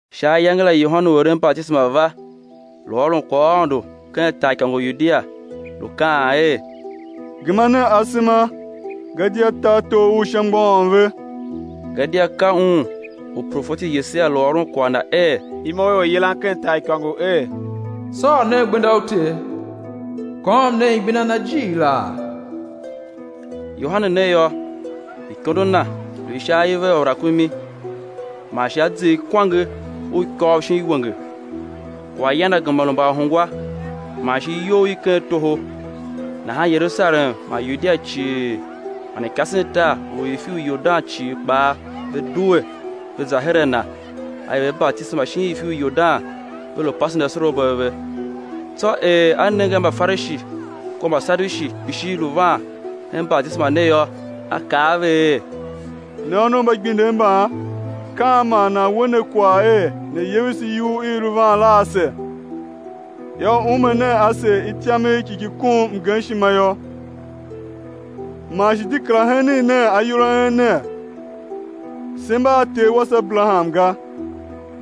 Sha ayange la Yohane u eren batisema va, lu ôron kwaghaôndo ken taaikôngo u Yudia, lu kaan er: Gema nen asema, gadia tartor u Sha mgbôghom ve. Gadia ka un u profeti Yesaia lu ôron kwagh na er: Imo i oryilan ken taaikôngo er: Sôr nen gbenda u Ter, kôôm nen igbenda Na jighilaa. Yohane ne yô, ikondo na lu i sha aive a rakumi, man shi a zer kwange u ikôv shin iwenge; kwaghyan na gema lu mbaahungwa man shi iyough i ken toho. Nahan Yerusalem man Yudia cii man ikasentar u ifi u Yordan cii kpaa, ve due, ve za her a na; a er ve batisema shin ifi u Yordan, ve lu pasen asorabo a ve. Tsô er a nenge a Mbafarishi kua Mbasadushi kpishi lu van hen batisema ne yô, a kaa a ve er: Ne ônov mba igbindev mban, ka an man nan we ne kwagh er né yevese iyugh i i lu van la ase? Yô, ume nen ase ityamegh ki ki kom mgemshima yô; man shi de kera henen nen ayol a en ner, se mba a ter wase Aberaham ga;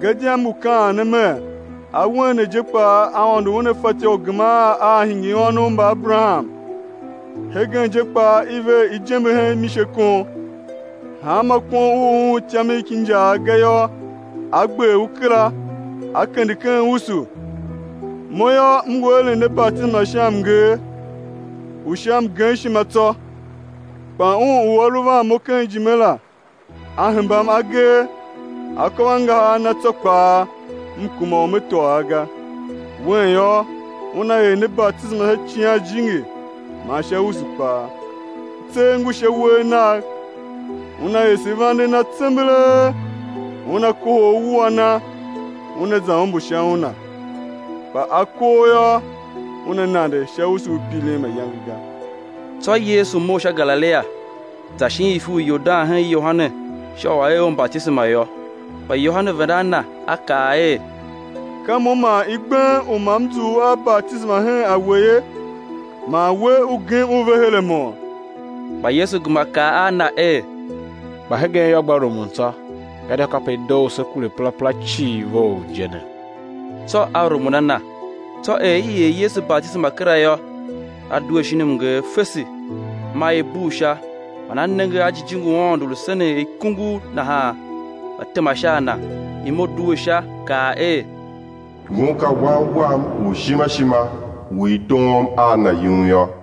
gadia m ngu kaan ne mer, awen ne je kpaa Aôndo Una fatyô u geman a̱ hingir ônov mba Aberaham. Hegen je kpaa i ver ijembe hen misekon; hanma kon u u um ityamegh ki injaagh ga yô, á gber u kera, á kende ken usu. Mo yô, m ngu eren ne batisema sha mnger u sha mgemshima tsô, kpa Un u A lu van mo ken ijime la, A hembam agee, akôvangahar a Na tsô kpaa, m kuma u me tôô a ga; Wen yô, Una er ne batisema sha Icighan Jijingi man sha usu kpaa; tser ngu sha uwegh Nagh, Una ese vande Na tsembelee, Una kohol uwua Na, una za ombo sha una, kpa akoo yô, Una nande sha usu u pirin mayange ga. Tsô Yesu mough sha Galilia, za shin ifi u Yordan hen Yohane sha u a̱ er Un batisema yô. Kpa Yohane venda a Na, a kaa er: Ka mo man i gbem u ma m zough a batisema hen a We ye, man We, U gem U ve her a mo? Kpa Yesu gema kaa a na er: Kpa hegen yô, gba rumun tsô, gadia kape i doo u sé kure perapera cii vough je ne. Tsô a rumun a Na. Tsô er i er Yesu batisema kera yô, A due shin mnger fese, maa i bugh Sha man A nenge a Jijingi u Aôndo lu senen er ikungugh nahan, va tema sha a Na. Imo due Sha, kaa er; Ngun ka Wan Wam u ishima ishima, u i doom a na yum yô.